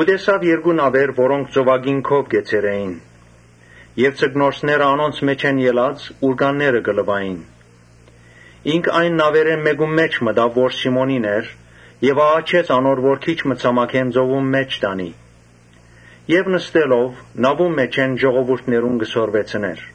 Տեսաւ երկու նաւեր, որոնք ծովակին քով կեցեր էին եւ ձկնորսները անոնց մէջէն ելած՝ ուռկանները կը լուային։ Ինք այն նաւերէն մէկուն մէջ մտաւ, որ Սիմոնինն էր եւ աղաչեց անոր որ քիչ մը ցամաքէն ծովուն մէջ տանի եւ նստելով՝ նաւուն մէջէն ժողովուրդին կը սորվեցնէր։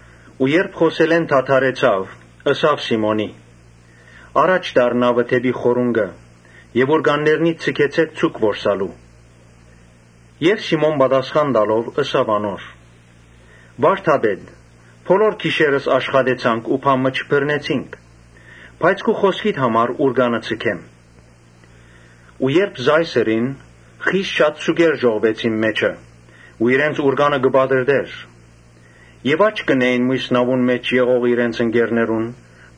Երբ խօսելէն դադրեցաւ, ըսաւ Սիմոնին. «Յառաջ տար նաւը՝ դէպի խորունկը եւ ուռկաննիդ ձգեցէք ձուկ որսալու»։ Սիմոն պատասխան տալով՝ ըսաւ անոր. «Վա՛րդապետ, բոլոր գիշերը աշխատեցանք ու բան մը չբռնեցինք. բայց քու խօսքիդ համար ուռկանը կը ձգեմ»։ Երբ ըսուածը ըրին, խիստ շատ ձուկեր ժողվեցին, անանկ որ իրենց ուռկանը կը պատռտէր։ Աչք կ’ընէին միւս նաւուն մէջ եղող իրենց ընկերներուն՝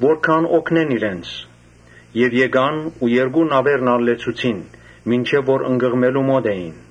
որ գան օգնեն իրենց։ Եկան ու երկու նաւերն ալ լեցուցին, գրեթէ ընկղմելու մօտ էին։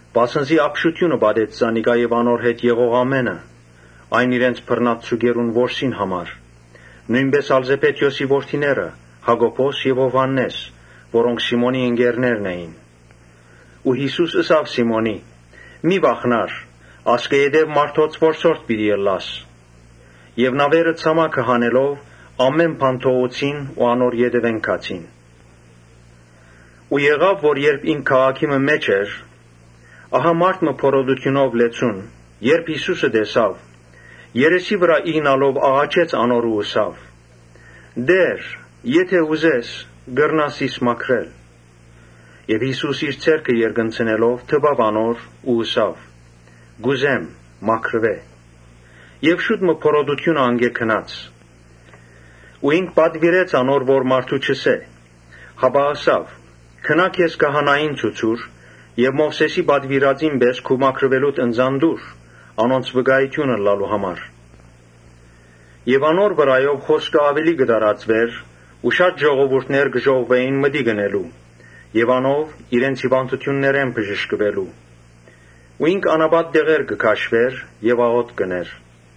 Վասն զի ապշութիւնը պատեց զանիկա եւ անոր հետ եղող ամէնքը՝ իրենց բռնած ձուկերուն շատութեան համար։ Նոյնպէս ալ Զեբեդէոսի որդիները՝ Յակոբոս եւ Յովհաննէս՝ որոնք Սիմոնին ընկերներն էին։ Յիսուս ըսաւ Սիմոնին. «Մի՛ վախնար, ասկէ ետեւ մարդոց որսորդ պիտի ըլլաս»։ Նաւերը ցամաք հանելով՝ ամէն բան թողուցին ու անոր ետեւէն գացին։ Օր մը, ինք քաղաքի մը մէջ էր, ահա մարդ մը բորոտութիւնով լեցուն՝ երբ Յիսուսը տեսաւ, երեսի վրայ իյնալով աղաչեց անոր ու ըսաւ. «Տէ՛ր, եթէ ուզես՝ կրնաս զիս մաքրել»։ Յիսուս իր ձեռքը երկնցնելով դպաւ անոր ու ըսաւ. «Կ’ուզե՛մ, մաքրուէ՛» եւ շուտ մը բորոտութիւնը անկէ գնաց։ Ու ինք պատուիրեց անոր, որ մարդու չըսէ, հապա, ըսաւ. «Գնա քեզ քահանային ցուցուր եւ Մովսէսին պատուիրածին պէս քու մաքրուելուդ ընծան տուր, անոնց վկայութիւն ըլլալու համար»։ Անոր լուրը աւելի կը տարածուէր ու շատ ժողովուրդ կը ժողվուէին մտիկ ընելու եւ իրենց հիւանդութիւններէն բժշկուելու։ Բայց ինք անապատ տեղեր կը քաշուէր եւ աղօթք կ’ընէր։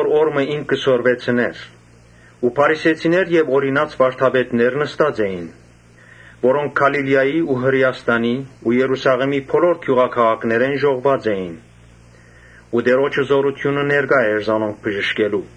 Օր մը երբ ինք կը սորվեցնէր, փարիսեցիներ եւ օրինաց վարդապետներ նստած էին, որոնք Գալիլիայի ու Հրէաստանի ու Երուսաղէմի բոլոր գիւղաքաղաքներէն ժողվուած էին ու Տէրոջը զօրութիւնը ներկայ էր զանոնք բժշկելու։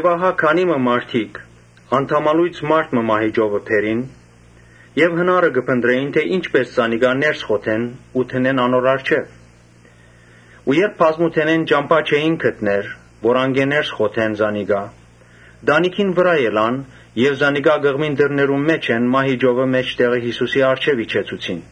Ահա քանի մը մարդիկ անդամալոյծ մարդ մը մահիճովը բերին եւ հնարը կը փնտռէին թէ ի՞նչպէս զանիկա ներս մտցնեն ու դնեն անոր առջեւ։ Ու երբ բազմութենէն ճամբայ չկրցան գտնել, որ անկէ ներս խոթեն զանիկա, տանիքին վրայ ելան եւ զանիկա կղմինտրներուն մէջէն մահիճովը՝ մէջտեղը Յիսուսին առջեւ իջեցուցին։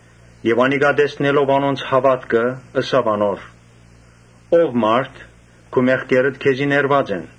Յիսուս տեսնելով անոնց հաւատքը՝ ըսաւ անոր. «Ո՛վ մարդ, քու մեղքերդ քեզի ներուած են»։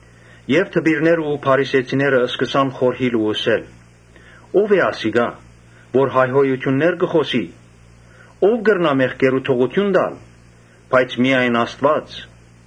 Դպիրներն ու փարիսեցիները սկսան խորհիլ ու ըսել. «Ո՞վ է ասիկա, որ հայհոյութիւններ կ’ընէ։ Ո՞վ կրնայ մեղքերու թողութիւն տալ, բայց միայն Աստուած»։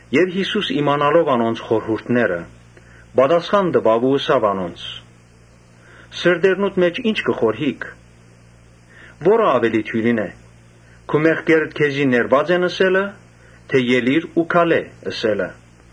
Յիսուս իմանալով անոնց խորհուրդները՝ պատասխան տուաւ ու ըսաւ անոնց. «Սրտերնուդ մէջ ի՞նչ կը խորհիք։ Ո՞րը աւելի դիւրին է, ‘Քու մեղքերդ քեզի ներուած են՝ ըսե՞լը, թէ Ելի՛ր ու քալէ՛՝ ըսելը’։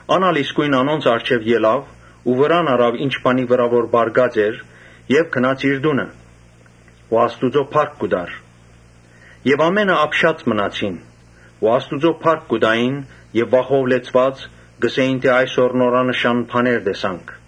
Ան ալ իսկոյն անոնց առջեւ ելաւ ու վրան առաւ ինչ բանի վրայ որ պառկած էր եւ գնաց իր տունը ու Աստուծոյ փառք կու տար։ Ամէնքը ապշած մնացին ու Աստուծոյ փառք կու տային եւ վախով լեցուած՝ կ’ըսէին. «Այսօր նորանշան բաներ տեսանք»։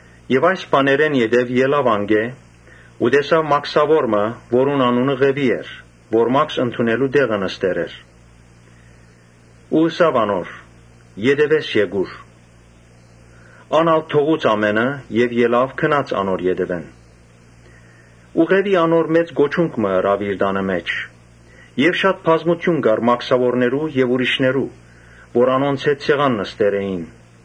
Այս բաներէն յետոյ ելաւ անկէ ու տեսաւ մաքսաւոր մը, որուն անունը Ղեւի էր, որ մաքս ընդունելու տեղը նստեր էր ու ըսաւ անոր. «Ետեւէս եկուր»։ Ան ալ թողուց ամէնքը եւ ելաւ գնաց անոր ետեւէն։ Ու Ղեւի մեծ կոչունք մը տուաւ իր տանը մէջ։ Շատ բազմութիւն կար մաքսաւորներու եւ ուրիշներու, որ անոնց հետ սեղան նստեր էին։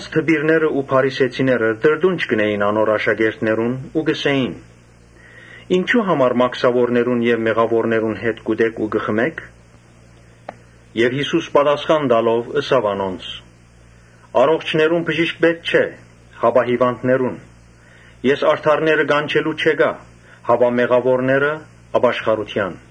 Դպիրներն ու փարիսեցիները տրտունջ կ’ընէին ու անոր աշակերտներուն կ’ըսէին. «Ինչո՞ւ համար մաքսաւորներուն հետ կ’ուտէք ու կը խմէք»։ Յիսուս պատասխան տալով՝ ըսաւ անոնց. «Առողջներուն բժիշկ պէտք չէ, հապա հիւանդներուն. Ես արդարները կանչելու չեկայ, հապա մեղաւորները՝ ապաշխարութեան»։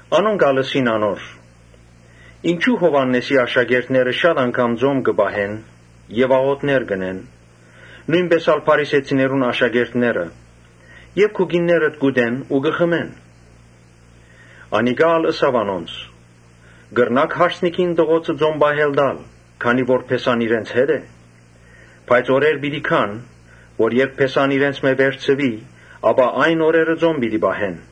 Անոնք ալ ըսին. «Ինչո՞ւ Յովհաննէսին աշակերտները շատ անգամ ծոմ կը պահեն եւ աղօթքներ կ’ընեն, նոյնպէս ալ փարիսեցիներուն աշակերտները. բայց քուկիններդ կ’ուտեն ու կը խմեն»։ Անիկա ալ ըսաւ անոնց. «Կրնա՞ք հարսանիքին տղոցը ծոմ պահել տալ՝ որքան ատեն որ փեսան իրենց հետ է։ Բայց օրեր պիտի գան՝ երբ փեսան իրենցմէ պիտի վերցուի, այն օրերուն ծոմ պիտի պահեն»։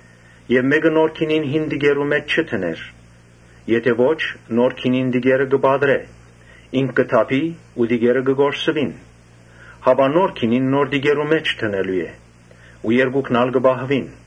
Եւ մէկը նոր գինին հին տիկերու մէջ չի դներ. եթէ ոչ՝ նոր գինին Ոմանք, հին տիկերըտիկերը կը պատռէ, ինք կը թափի ու տիկերը կը կորսուին. Հապա նոր գինին նոր տիկերու մէջ դնելու է, որպէս զի երկուքն ալ պահուին։